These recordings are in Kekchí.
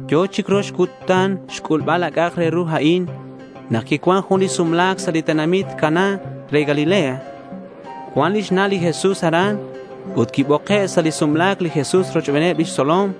Yo̱ chic rox cutan xc'ulbal a c'a'ak re ru a'in nak quicuan jun li sumla̱c sa' li tenamit Caná re Galilea. Cuan lix na' li Jesús aran. Ut quiboke' sa' li sumla̱c li Jesús rochbeneb lix tzolom.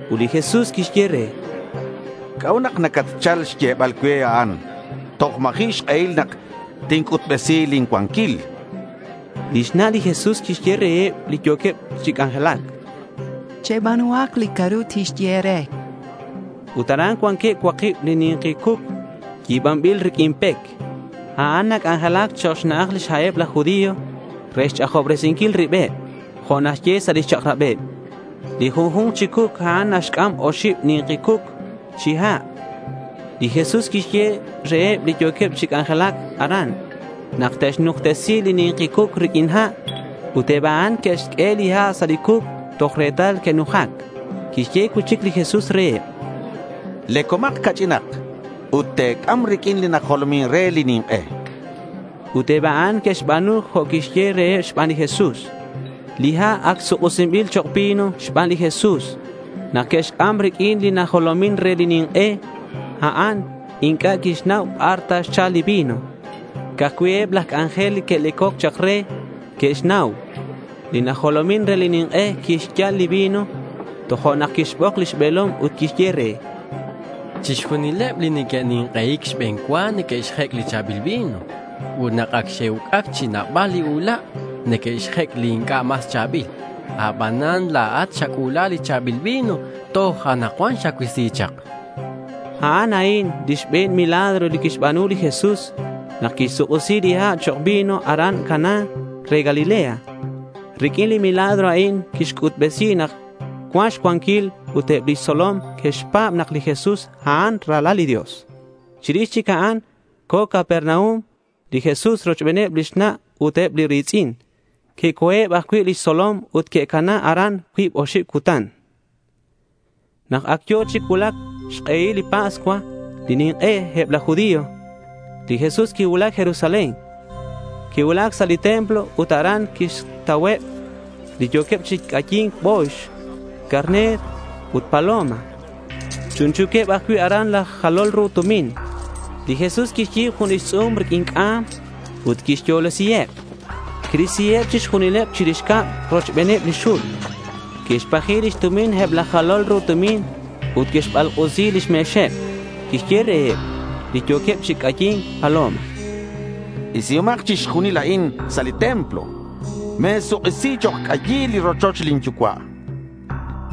Ut li Jesús quixye re: —¿C'a'ut nak nacatchal xyebal cue a'an? Toj ma̱ji' xk'ehil nak tinc'utbesi lin cuanquil, chan re lix na'. Lix na' li Jesús quixye reheb li yo̱queb chi c'anjelac: —Cheba̱nuhak li c'a'ru tixye e̱re, chan. Ut aran cuanqueb cuakib li ni̱nki cuc yi̱banbil riq'uin pec. A'an nac'anjelac chok' xna'aj xha'eb laj judío re xch'ajobresinquil ribeb jo' naxye sa' lix chak'rabeb. Li junju̱nk chi cuc a'an naxc'am oxib ni̱nki cuc chi ha'. Li Jesús quixye reheb li yo̱queb chi c'anjelac aran nak te'xnujtesi li ni̱nki cuc riq'uin ha'. Ut eb a'an que'xq'ue li ha' sa' li cuc toj retal que'nujac. Quixye cui'chic li Jesús reheb: —Lecomak ca'ch'inak ut te̱c'am riq'uin li najolomin re li nink'e, chan. Ut eb a'an que'xba̱nu jo' quiyehe' reheb xban li Jesús. Li ha' ac suk'isinbil chok' vino xban li Jesús nak que'xc'am riq'uin li najolomin re li nink'e. A'an inc'a' quixnau bar ta xchal li vino. Ca'aj cui' eb laj c'anjel li que'lecoc chak re que'xnau. Li najolomin re li nink'e quixyal li vino. Tojo'nak quixbok li be̱lomej ut quixye re: —Chixjunileb li neque'nink'ei̱c xbe̱n cua neque'xjec' li cha̱bil vino. Ut nak ac xe'uc'ac chi nabal li ula', neque'xjec' li inc'a' mas cha̱bil. Abanan la̱at xac'u̱la li cha̱bil vino ut toj anakcuan xacuisi chak, chan re. A'an a'in li xbe̱n milagro li quixba̱nu li Jesús nak quixsuk'isi li ha' chok' vino aran Caná re Galilea. Riq'uin li milagro a'in quixc'utbesi nak cuan xcuanquil ut eb lix tzolom que'xpa̱b nak li Jesús a'an li Ralal li Dios. Chirix chic a'an co̱ Capernaum li Jesús rochben lix na' ut eb li ri̱tz'in. Que'co̱eb ajcui' lix tzolom ut que'cana aran cuib oxib cutan. Nak ac yo̱ chi cuulac xk'ehil li Pascua, lix nink'e eb laj judío, li Jesús quicuulac Jerusalén. Quicuulac sa' li templo ut aran quixtauheb li yo̱queb chi c'ayi̱nc bo̱yx, carner ut paloma. Chunchu̱queb ajcui' aran laj jalol ru tumin. Li Jesús quixyi̱b jun lix tz'u̱m riq'uin c'am ut quixyolesiheb. Quirisiheb chixjunileb chirix cab rochbeneb lix xul. Quixpaji lix tumin eb laj jalol ru tumin ut quixbalk'usi lix me̱xeb. Quixye reheb li yo̱queb chi c'ayi̱nc paloma: —Isihomak chixjunil a'in sa' li templo. Me̱suk'isi chok' c'ayil li rochoch lin Yucua', chan li Jesús reheb.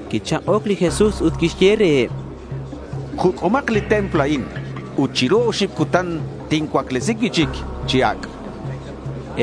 Quichak'oc li Jesús ut quixye reheb: —Juc'umak li templo a'in ut chiru oxib cutan tincuaclesi cui'chic chi ac', chan reheb.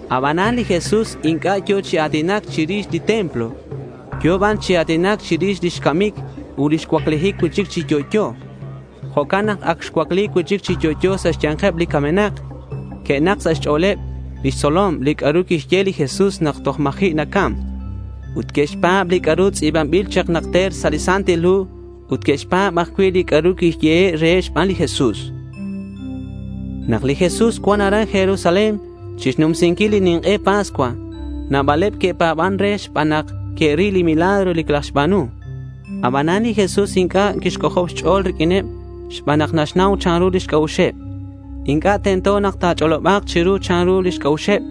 Abanan li Jesús inc'a' yo̱ chi a̱tinac chirix li templo. Yo̱ ban chi a̱tinac chirix lix camic ut lix cuaclijic cui'chic chi yo'yo. Jo'can nak ac xcuacli cui'chic chi yo'yo sa' xya̱nkeb li camenak, que'nak sa' xch'o̱leb lix tzolom li c'a'ru quixye li Jesús nak toj ma̱ji' nacam. Ut que'xpa̱b li c'a'ru tz'i̱banbil chak najter sa' li Santil Hu ut que'xpa̱b ajcui' li c'a'ru quiyehe' reheb xban li Jesús. Nak li Jesús cuan aran Jerusalén chixnumsinquil li nink'e Pascua, nabaleb que'pa̱ban re xban nak que'ril li milagro li quilajxba̱nu. Abanan li Jesús inc'a' quixc'ojob xch'o̱l riq'uineb xban nak naxnau chanru lix c'a'uxeb. Inc'a' tento nak ta̱ch'oloba̱k chiru chanru lix c'a'uxeb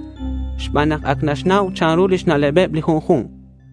xban nak ac naxnau chanru lix na'leb li junju̱nk.